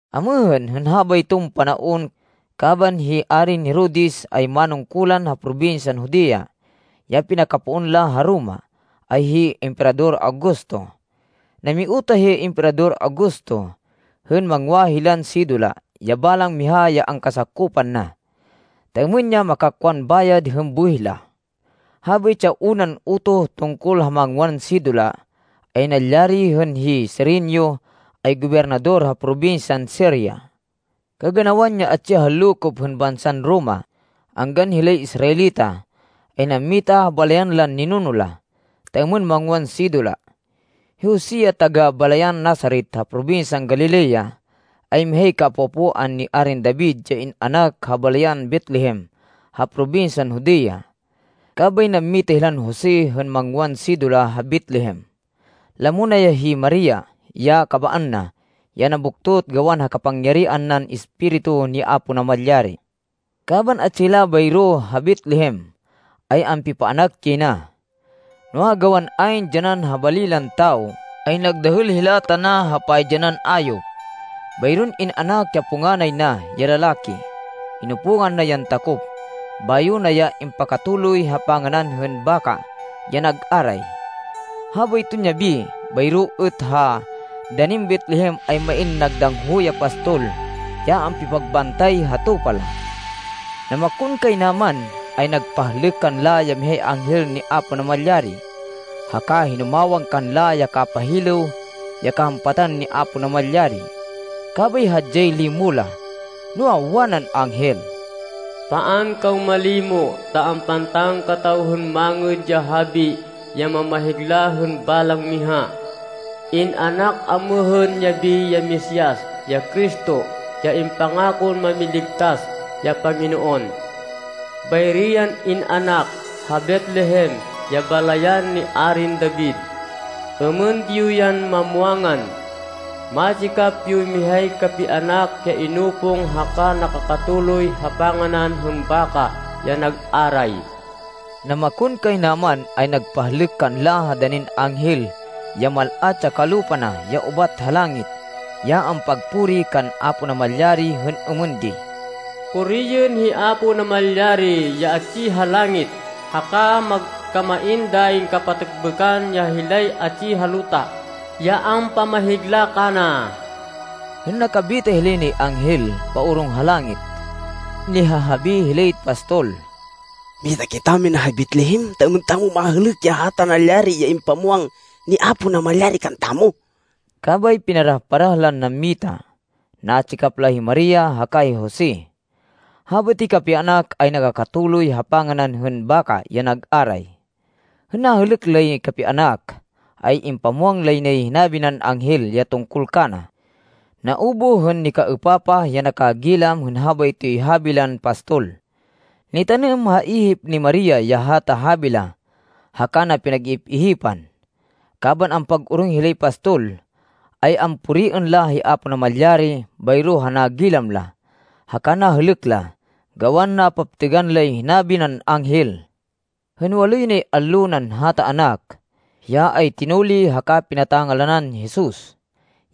Amêhên, hên habayton panaon, kaban hi Arin Herodes ay manungkulan ha probinsyan Judea, ya pinakapoon la ha Roma, ay hi Emperador Augusto. Namiutoh ya hi Emperador Augusto hên mangwa hilan sidula, ya balang miha ya angkasakopan na, ta êmên ya makakwan bayad hên buwih la. Habaytsi ya unan utoh tungkol ha mangwan sidula ay nalyari hên hi Cirenio ay gobernador ha probinsyan Siria. Kaganawan ya atsi ha lokop hên bansan Roma, anggan hilay Israelita, ay nammita ha balayan lan ninuno la, ta êmên mangwan sidula. Hi Jose, ya taga-balayan Nazaret, ha probinsyan Galilea, ay mihay kaapo-apoan ni Arin David ya in-anak ha balayan Betlehem ha probinsyan Judea. Kabay nammita hilan Jose hên mangwan sidula ha Betlehem. Lamo na ya hi Maria, ya kabaan na, ya nabuktot gawan ha kapangyarihan nan Espiritu ni Apo Namalyari. Kaban atsi hila bayro ha Betlehem, ay ampipaanak yay na. Noa, gawan ayn dyanan ha bali lan tawo ay nagdahêl hila tana ha paydyanan ayop. Bayron in-anak ya punganay na ya lalaki. Inupungan na yan takop, bayo na ya impakatuloy ha panganan hên baka ya nag aray. Habayton yabi, bayro êt ha danin Betlehem ay main nagdangho ya pastol ya ampipagbantay ha tupa la. Namakonkaynaman ay nagpahlêk kanla ya mihay anghel ni Apo Namalyari, haka hinumawang kanla ya kapahilêw ya kahampatan ni Apo Namalyari. Kabay hadyay limo la. Noa, wanan anghel, “Paan kaw malimo ta ampantan kataw hên mangêd ya habi ya mamahigla hên balang miha. In-anak amêhên yabi ya Mesias, ya Cristo, ya impangakon Mámiligtas, ya Panginoon. Bayri yan in-anak ha Betlehem, ya balayan ni Arin David. Êmên di yo yan mamwangan. Matsikap yoy mihay kapianak ya inupong haka nakakatuloy ha panganan hên baka ya nag aray.” Namakonkaynaman ay nagpahlêk kanla ha danin anghel ya mal-at ya kalupa na ya ubat ha langit ya ampagpuri kan Apo Namalyari hên êmên di, “Puriên hi Apo Namalyari ya atsi ha langit. Haka magkamain dayin kapatêkbêkan ya hilay atsi ha luta ya ampamahigla kana.” Hên nakabita hilay nay anghel paorong ha langit, nihahabi hilay pastol. “Mita kitamina ha Betlehem ta êmên tamo mahêlêk ya hata nalyari ya impamwang ni Apo Namalyari kantamo.” Kabay pinarah-parah lan nammita. Natsikap la hi Maria haka hi Jose. Habaytoy kapianak ay nakakatuloy ha panganan hên baka ya nag aray. Hên nahêlêk lay kapianak, ay impamwang lay nay hinabi nan anghel ya tungkol kana. Naubuh hên nikaêpapah ya nakagilam hên habaytoy habi lan pastol. Nitanêm ha ihip ni Maria ya hata habi la haka na pinag-ihip-ihipan. Kaban ampag-orong hilay pastol, ay ampuriên la hi Apo Namalyari bayro ha nagilam la haka nahêlêk la gawan napaptêgan lay hinabi nan anghel. Hên waloy nay allo nan hata anak, hiya ay tinuli haka pinata-ngalanan Jesus,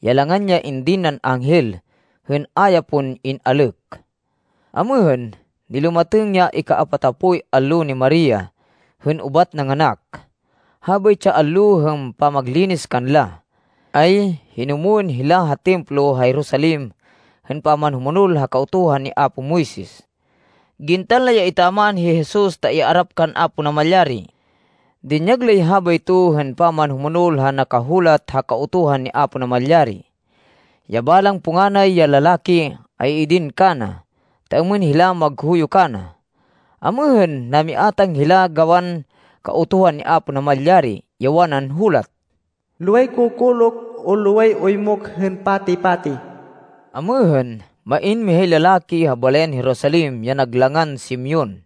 ya langan ya indin nan anghel hên a ya pon in-alêk. Amêhên, nilumatêng ya ikaapatapoy allo ni Maria hên ubat nanganak. Habaytsi ya allo hên pamaglinis kanla, ay hinumwên hila ha Templo ha Jerusalem hên pamanhumonol ha Kautuhan ni apo Moises. Gintan la ya etaman hi Jesus ta iarap kan Apo Namalyari. Dinyag lay habayto hên pamanhumonol ha nakahulat ha Kautuhan ni Apo Namalyari ya balang punganay ya lalaki ay idin kana, ta êmên hila maghuyo kana. Amêhên, namiátang hila gawan Kautuhan ni Apo Namalyari ya wanan hulat, “Loway kokolok o loway oymok hên pati-pati.” Amêhên, main mihay lalaki ha balayan Jerusalem ya nag langan Simeon.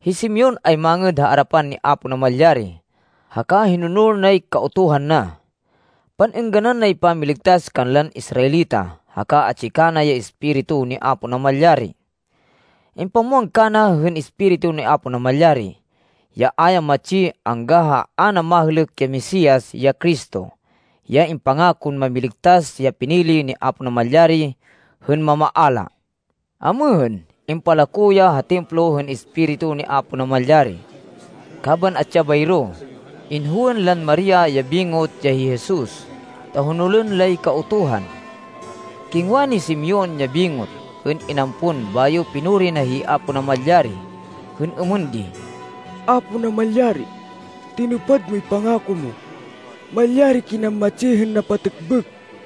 Hi Simeon ay mangêd ha arapan ni Apo Namalyari haka hinonol nay Kautuhan na. Pan-êngganan nay pamiligtas kanlan Israelita haka atsi kana ya Espiritu ni Apo Namalyari. Impamwang kana hên Espiritu ni Apo Namalyari, ya a ya matsi, angga ha a na mahêlêk ya Mesias, ya Cristo, ya impangakon Mámiligtas ya pinili ni Apo Namalyari hên mamaala. Amêhên, impalako ya ha Templo hên Espiritu ni Apo Namalyari. Kaban atsi ya bayro, inhowên lan Maria ya bingot ya hi Jesus ta honolên lay Kautuhan. Kingwa ni Simeon ya bingot hên inampon bayo pinuri na hi Apo Namalyari hên êmên di, “Apo Namalyari, tinupad moy pangako mo. Malyari kinan matsi hên napatêkbêk,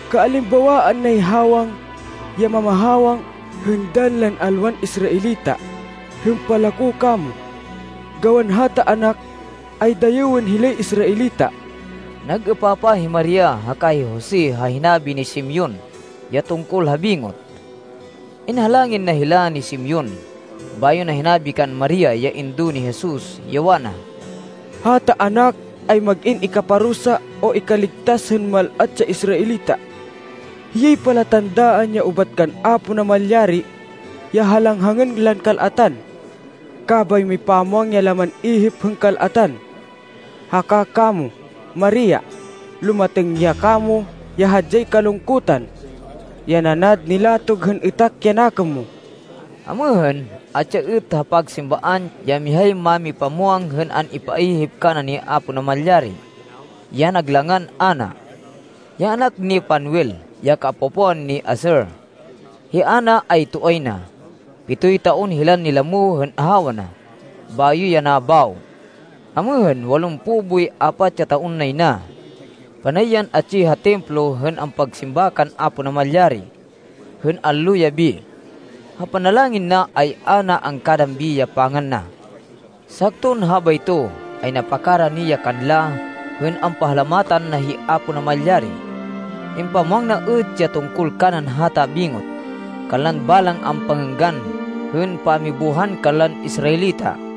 Kaalimbawaan nay hawang ya mamahawang hên dann lan alwan Israelita hên palako kamo. Gawan hata anak, ay dayêwên hilay Israelita.” Nag-êpapah hi Maria haka hi Jose ha hinabi ni Simeon ya tungkol ha bingot. Inhalangin na hila ni Simeon bayo na hinabi kan Maria ya indo ni Jesus, ya wana, “Hata anak ay mag-in ikaparusa o ikaligtas hên mal-at ya Israelita. Hiyay palatandaan ya ubat kan Apo Namalyari ya halanghangên lan kal-atan. Kabay mipamwang ya laman ihip hên kal-atan. Haka kamo, Maria, lumatêng ya kamo ya hadyay kalungkutan, ya nanad nilatog hên êtak ya nakêm mo.” Amêhên, atsi ya êt ha pagsimbaan ya mihay mámipamwang hên an-ipaihip kana ni Apo Namalyari ya nag langan Ana, ya anak ni Fanuel, ya kaapo-apoan ni Aser. Hi Ana ay toay na. Pitoy taon hilan nilamo hên ahawa na bayo ya nabawo. Amêhên walumpo boy apat ya taon nay na. Panay yan atsi ha Templo hên ampagsimba kan Apo Namalyari hên allo-yabi. Ha panalangin na ay a na angkadambi ya pangan na. Sakton habayto, ay napakarani ya kanla hên ampahalamatan na hi Apo Namalyari. Impamwang na êt ya tungkol kanan hata bingot kanlan balang ampangênggan hên pamibuhan kanlan Israelita.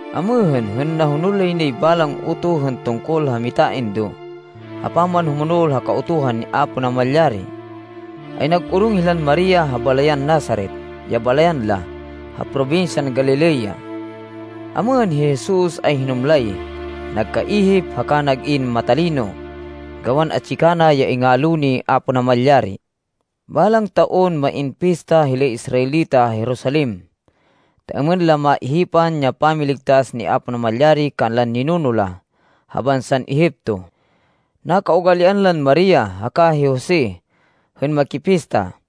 Amêhên, hên nahonol lay nay balang utoh hên tungkol ha mitaindo ha pamanhumonol ha Kautuhan ni Apo Namalyari, ay nag-orong hilan Maria ha balayan Nazaret, ya balayan la, ha probinsyan Galilea. Amêhên, hi Jesus ay hinumlay, nagkaihip, haka nag-in matalino gawan atsi kana ya ingalo ni Apo Namalyari. Balang taon main pista hilay Israelita ha Jerusalem, ta êmên la maihipan ya pamiligtas ni Apo Namalyari kanlan ninuno la ha bansan Egipto. Nakaugalian lan Maria haka hi Jose hên makipista.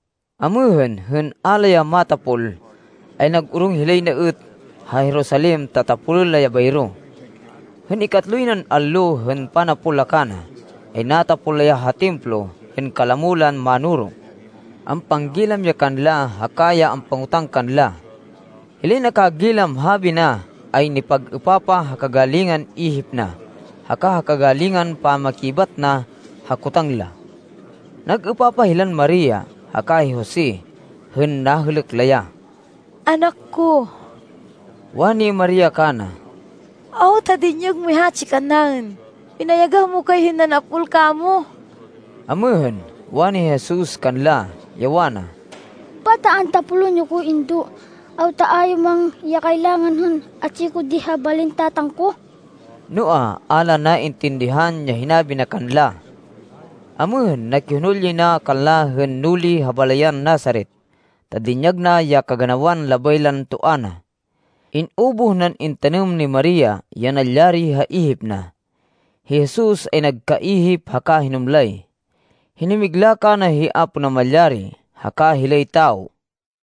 Amêhên, hên a la ya matapol ay nag-orong hilay na êt ha Jerusalem ta tapolên la ya bayro. Hên ikatloy nan allo hên panapol la kana, ay natapol la ya ha Templo hên kalamo lan mánoro. Ampanggilam ya kanla, haka ya ampangotang kanla. Hilay nakagilam habi na ay nipag-êpapah ha kagalingan ihip na haka ha kagalingan pamakibat na ha kotang la. Nag-êpapah hilan Maria haka hi Jose hên nahêlêk la ya. “Anak ko,” wani Maria kana, “awta dinyag moy hatsi kannaên? Pinayagah mo kay hên nanapol kamo.” Amêhên, wani Jesus kanla, ya wana, “Pata antapolên yo ko, Indo? Awta a yo muwang ya kailangan hên atsi ko di ha balin Tatang ko?” Noa, a la naintindihan ya hinabi na kanla. Amêhên, nakihonol yay na kanla hên nuli ha balayan Nazaret ta dinyag na ya kaganawan labay lan toa na. In-ubuh nan intanêm ni Maria ya nalyari ha ihip na. Hi Jesus ay nagkaihip haka hinumlay. Hinumigla kana hi Apo Namalyari haka hilay tawo.